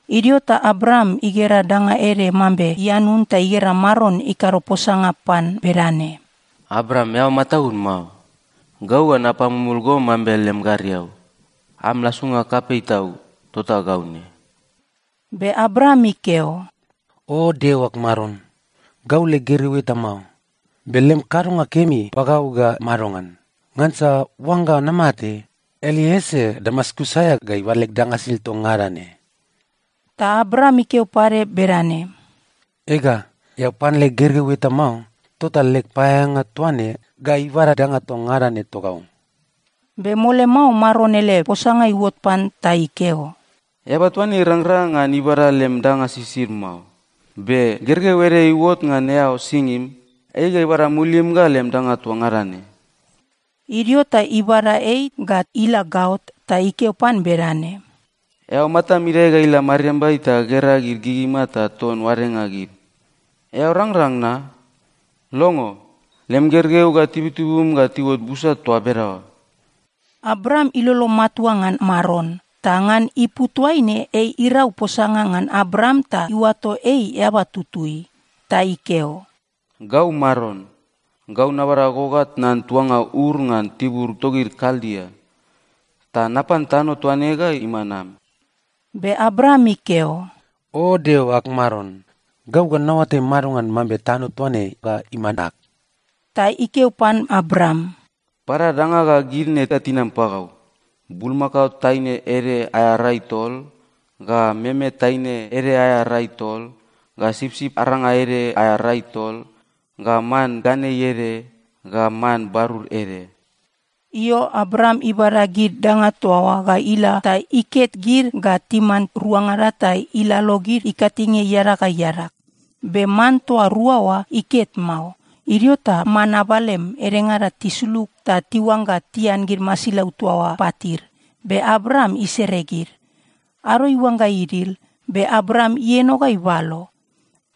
Idio ta Abram igera danga ede mambe ianun ta igera Maron ikado posanga pan bedane, “Abram, eao mataud mao. Gau ga napamumul go mambe lem gariau. Am lasunga kapei tau, tota gau ne.” Be Abram ikeo, “O Deo ag Maron! Gau leg gergeu eta mao, be lem kadonga kemi pagau ga madongan? Ngansa oangga namate, Elieser Damaskus aea ga ibada leg danga sisid toa ngada ne.” Ta Abram ikeo pade bedane, “Ega, eao pan leg gergeu eta mao, tota leg paeaeanga toa ne ga ibada danga toa ngada ne togau.” Be mole mao Maron ele posanga iuot pan ta ikeo, “Eaba toa ne irangrang ngan ibada lem danga sisid mao, be gergeu ede iuot ngan eao singim, ei ga ibada mulim ga lem danga toa ngada ne.” Idio ta ibada ei ga ila gaot, ta ikeo pan bedane, “Eao matam idae ga ila mariambai ta gera gid gigima ta ton oadenga gid. Eao rangrang na? Longo, lem gergeu ga tibutibum ga tiuot busa toa bedaoa.” Abram ilolo matua ngan Maron, ta ngan ipu toaine ei irau posanga ngan Abram ta iuato ei eaba tutui. Ta ikeo, “Gau Maron. Gau nabada go ga tnan tuanga Ur ngan tibur togid Kaldia, ta napan tano toa ne ga iman am.” Be Abram ikeo, “O Deo ag Maron! Gau ga naoatai madongan mambe tano toa ne ga iman ag?” Ta ikeo pan Abram, “Bada danga ga gid ne ga tinam pagau: bulmakao taine ede aea rai tol, ga meme taine ede aea rai tol, ga sipsip aranga ede aea rai tol, ga man ganei ede, ga man barur ede.” Io, Abram ibada gid danga toa oa ga ila ta iket gid ga timan ruangada ta ilalo gid ikatinge iadag ga iadag. Be man toa rua oa, iket mao. Idio ta man abalem edengada tisulug ta tiuangga tian gid masilau toa oa patid, be Abram isere gid. Ado iuangga idil, be Abram ieno ga ibalo.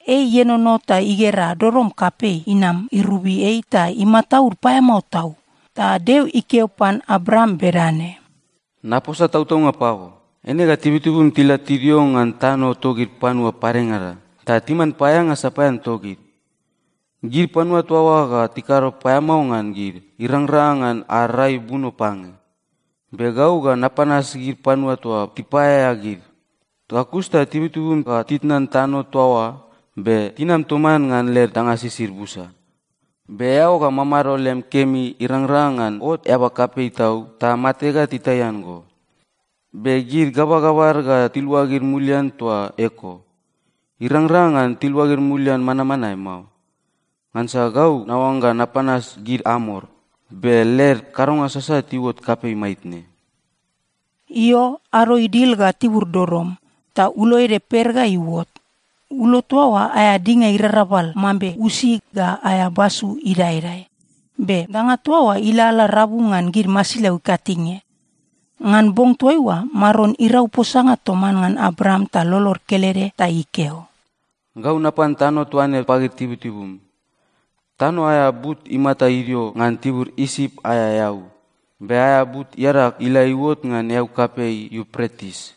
Ei ienono ta igera dodom kapei inam irobi ei ta imataud paeamao tau. Ta Deo ikeo pan Abram bedane, “Naposa tautaunga pago, eine ga tibutibum tila tidio ngan tano togid panua padengada, ta timan paeaeanga sapaean togid. Gid panua toa oa ga tikado paeamao ngan gid irangrang ngan ad rai buno pange. Be gau ga napanas gid panua toa tipaeaea gid. Ga kus ta tibutibum ga titnan tano toa oa, be tinam toman ngan led danga sisid busa. Be eao ga mamado lem kemi irangrang ngan ot eaba kapei tau ta mate ga titaian go. Be gid gabagabad ga tiluagid mulian toa eko. Irangrang ngan tiluagid mulian manmanae mao, ngansa gau naoangga napanas gid Amor, be led kadonga sasat iuot kapei maitne.” Io, ado idil ga tibur dodom, ta ulo ede per ga iuot. Ulo toa oa aea dinga irarabal mambe usi ga aea basu idaedae, be danga toa oa ilalala rabu ngan gid masilau ikatinge. Ngan bong toaiua Maron irau posanga toman ngan Abram ta lolod kelede ta ikeo, “Gau napan tano toa ne pagid tibutibum. Tano aea but imata idio ngan tibur Isip aea eau, be aea but iadag ila iuot ngan eau kapei Iupretis.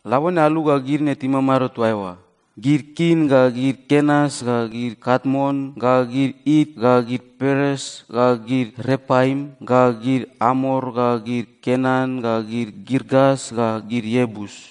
Labone alu ga gid ne timamado toa eoa: gid Kin ga gid Kenas ga gid Katmon ga gid It ga gid Peres ga gid Repaim ga gid Amor ga gid Kenan ga gid Girgas ga gid Iebus.”